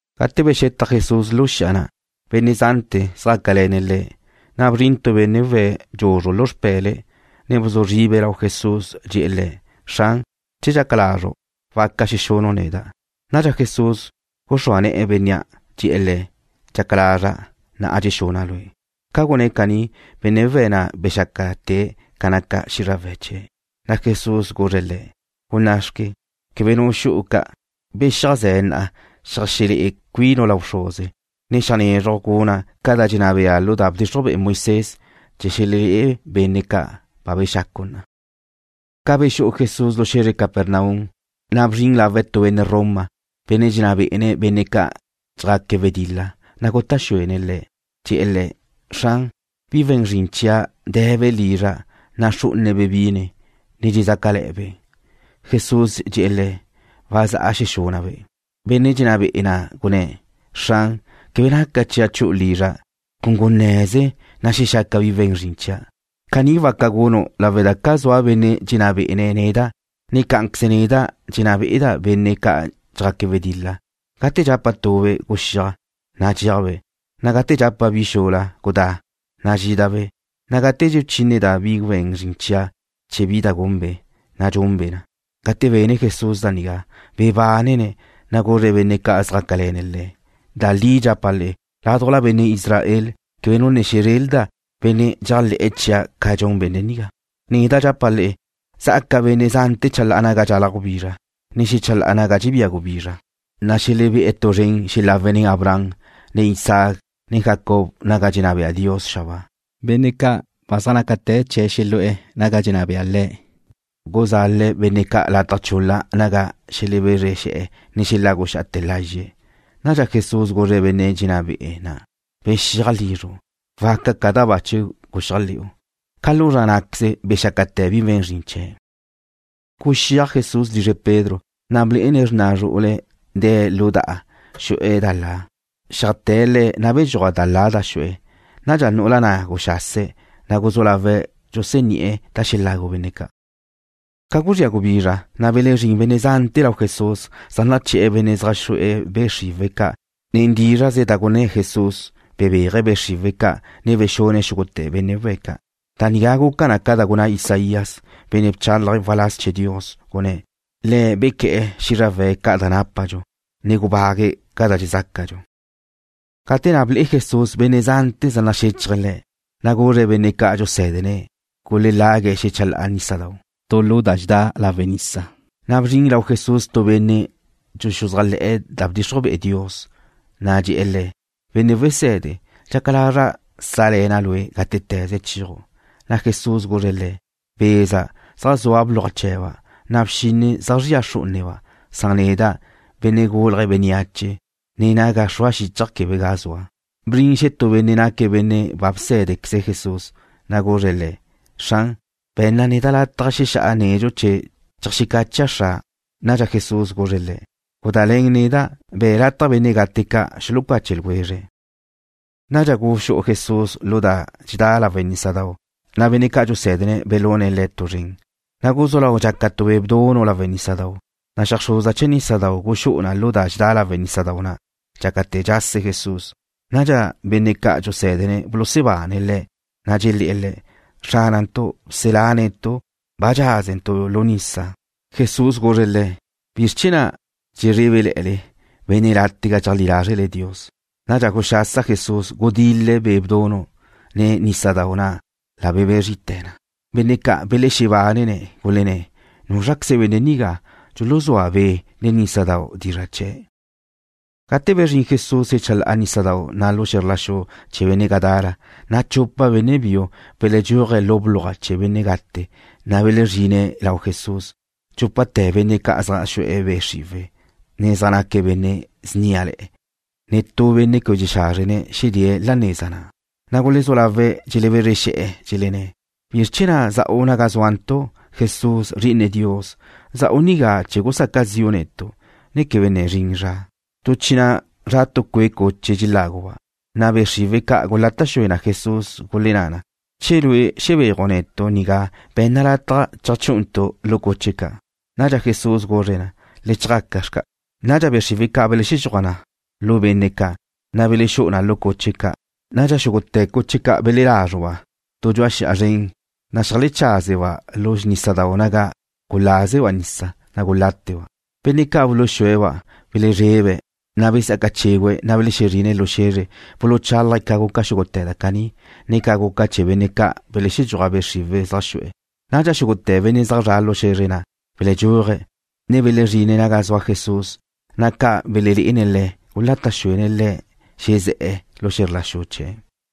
Gate bexetaj Jesús lu xi'a na', benne' zante̱ zjácale̱ne̱' Le̱'. Na' bzrin tu benne' we̱' dxuzru lu xpe̱le̱', ne bzu zribe̱' lau Jesús. Dxe̱'e̱ Le̱': ―Xran, che dxaca lazru', waca xexunu' neda'. Nadxa Jesús guxrúa ne̱'e̱ bénnea'. Dxe̱'e̱ le̱': ―Dxaca lazra'. Na'a dxexuna' lue'. Ca gunné̱' caní, benne' we̱' na' bexácate̱' ca naca xízrawe̱' chee̱'. Na' Jesús guzre̱' le̱': ―Gunná' xque. Quebe nu xu'u ca'. Bexíajze na'a xeajxelé'e cuinu' lau bxruze, ne xeajnezruj guna' ca da dxenná bea lu da bdxixruj be'e Moisés, chee̱ xelelé'e benne' ca' ba bexacu' na'a. Ca bexú'u Jesús lu xe̱zre Capernaum, na' bzrin lawe' tu benne' Roma, benne' dxenná be'ene̱' benne' ca' dxjaque̱' wedil-la, na' guta' xuene̱' Le̱', dxe̱'e̱ Le̱': ―Xran, bi we̱n zrin chia' de̱be' lizra'. Naxrú'unebe' bine, ne dxezácale̱'e̱be'. Jesús dxe̱'e̱ le̱': ―Wazá'a xexuna'-be'. Benne' dxenná be'e̱ na' gunné̱': ―Xran, quebe naca chia' chu'u lizra'. Cun gunne̱ze, na' xexaca bi we̱n zrin chia'. Caní waca gunu' lawe' da zua benne' dxenná bé'ene̱' neda', ne cá'anqueze neda' dxenná be'eda' benne' ca' dxjaque̱' wedil-la. Gate dxapa' tube': “Guxíaj”, na' dxéajbe'. Na' gate dxapa' bi xula: “Gudá”, na' dxídabe'. Na' gate dxuchíneda' bi we̱n zrin chia' chee̱ bi da gunbe', na' dxunbe' na. Gate bene Jesús da nigá, bebánene̱', na' guzre̱' benne' ca' zjácale̱ne̱' Le̱': ―Da li dxapa' le'e, ládujla benne' Israel quebe nu ne xezrelda', benne' dxéajle̱'e̱ chia' ca dxun benne' nigá. Neda' dxapa' le'e, zá'aca benne' zante̱ chalá'a naga dxalaj gubizra, ne xechalá'ala naga dxebía gubizra, na' xelebé'e̱ tu zren xelawe̱' nen Abraham, ne Isaac, ne Jacob naga dxenná bea Dios xabáa. Benne' ca' gucá'a zga'ale Dios chee̱ xelu'e̱ naga dxenná bea Le̱', guzale̱' benne' ca' lataj chul-la naga xelebezre̱', ne xeláguxa'ate̱ lazxe̱'. Nadxa Jesús guzre̱' benne' dxenná be'e̱ na': ―Bexíaj lizru'. Waca ca da ba guxéajle̱'u. Ca lu zra ná'queze bexácate̱ bi we̱n zrin chee̱'. Guxíaj Jesús lizre Pedro, na' blé'ene̱' xrna zru'ule̱' de̱' lu da'a, xu'e̱ da la. Xeajté̱' ne̱'e̱, na' bedxúaj da la da xu'e̱. Nadxa nu'ula na' guxase̱', ne guzú lawe̱' dxusení'e̱ da xelagu benne' ca'. Ca guzría gubizra, na' belezrín benne' zante̱ lau Jesús, zaj naché̱'e̱ benne' zaj xu'e̱ be' xriwe̱' ca'. Nen dízra'ze da gunná Jesús, bebéaje̱' be' xriwe̱' ca', ne bexune̱' xúgute̱ benne' we̱' ca'. Da nigá guca na ca da gunná Isaías, benne' bchálaje̱' waláz chee̱ Dios, gunné̱': “Le̱' bequé̱'e̱ xízrawe̱' ca' da nápadxu, ne gubague̱' ca da dxezácadxu.” Gate na' ble'e Jesús benne' zante̱ zaj naxéchaje̱' Le̱', na' guzre̱' benne' ca' dxusé̱dene̱' gulelague̱' xechalá'a nísadau' tu lu da dxedá lawe' nisa. Na' bzrin lau Jesús tu benne' dxuxuzájle̱'e̱ da bdxixruj be'e Dios, na' dxe̱'e̱ Le̱': ―Benne' Wesede, dxaca lazra' sále̱na' Lue' gátete̱ze chéaju'. Na' Jesús guzre̱' le̱': ―Beza' zaj zua bluaj chee̱ba', na' bxinne zaj zria xrú'uneba', san neda', Benne' Gulje̱' Bénneache, ne naga xrua xíchaja' quebe ga zua. Bzrin xetú benne' naque̱' benne' ba bsé̱dequeze Jesús, na' guzre̱' Le̱': ―Xran, be̱nna neda' lataj xexá'a nedxu chee̱ cheajxecacha' xra'. Nadxa Jesús guzre̱' le̱': ―Gudále̱n neda'. Be̱' lataj benne' gate ca' xulucache ljwezre̱'. Nadxa guxú'u Jesús lu da dxedá lawe' nísadau', na' benne' ca' dxusé̱dene̱' belune̱' Le̱' tu zren. Na' guzú lau dxaca tu be' bdunu' lawe' nísadau', na' xeajxruza chee̱ nísadau' guxú'u na lu da dxedá lawe' nísadau' na', dxácate̱ dxase Jesús. Nadxa benne' ca' dxusé̱dene̱' bulusebane̱' Le̱', na' dxelé̱'e̱ Le̱': ―Xránantu'. Bselá netu'. Ba dxázentu' lu nisa. Jesús guzre̱' le̱': ―¿Bizr chee̱ na' dxezrébele̱'e̱le? Nácale benne' látega dxeleajlí lázre' Dios. Nadxa guxasa Jesús. Gudil-le̱' be' bdunu', ne nísadau', na' la belebé zrite̱ na. Benne' ca' belexebánene̱', gulenné̱': ―¿Núzraqueze benne' nigá? Dxuluzúa be', ne nísadau' dizra' chee̱'. Gate bezrín Jesús xechalá'a nísadau' na' lu xe̱zr la xu chee̱ benne' Gadara, na' chupa benne' biu belexedxúaje̱' lu bluaj chee̱ benne' gate, na' belezrine̱' lau Jesús. Dxúpate̱ benne' ca' zaj xu'e̱ be' xriwe̱', ne zaj naque̱' benne' sníale̱'e̱, na' netú benne' quebe dxexázrene̱' xedée̱' la neza na'. Na' gulezú lawe' dxelebézrexe̱'e̱. Dxelenné̱': ―¿Bizr chee̱ na' za'u naga zúantu', Jesús, Zri'ine Dios? ¿Za'u nigá chee̱ gusaca zi'u netu', ne quebe ne zrin zra? Tu chi na' zra tu cue' cuche dxeláguba'. Be' xriwe̱' ca' gulata' xue na Jesús, gulenná na: ―Che Lue' xebéaju' netu' nigá, be̱nna lataj cheajchú'untu' lu cuche ca'. Nadxa Jesús guzre̱' na: ―Le chjaca xca'. Nadxa be' xriwe̱' ca' belexedxúaj na lu benne' ca', na' belexú'u na lu cuche ca'. Nadxa xúgute̱ cuche ca' belelázruba' tu dxu'a xi'a zren, na' xeajlecházeba' lu nísadau' naga gulázeba' nisa, na' guláteba'. Benne' ca' buluxúe̱'-ba' belezrebe̱', na' besá'aca chégüe̱', ne belexezrine̱' lu xe̱zre. Buluchálaje̱' ca guca xúgute̱ da caní, ne ca guca chee̱ benne' ca', belexedxúaj be' xriwe̱' zaj xu'e̱. Nadxa xúgute̱ benne' zaj zre̱'e̱ lu xe̱zre na' beledxúaje̱', ne belezrine̱' naga zua Jesús. Na' ca belelé'ene̱' Le̱', gulata' xuene̱' Le̱' xezé̱'e̱ lu xe̱zr la xu chee̱'.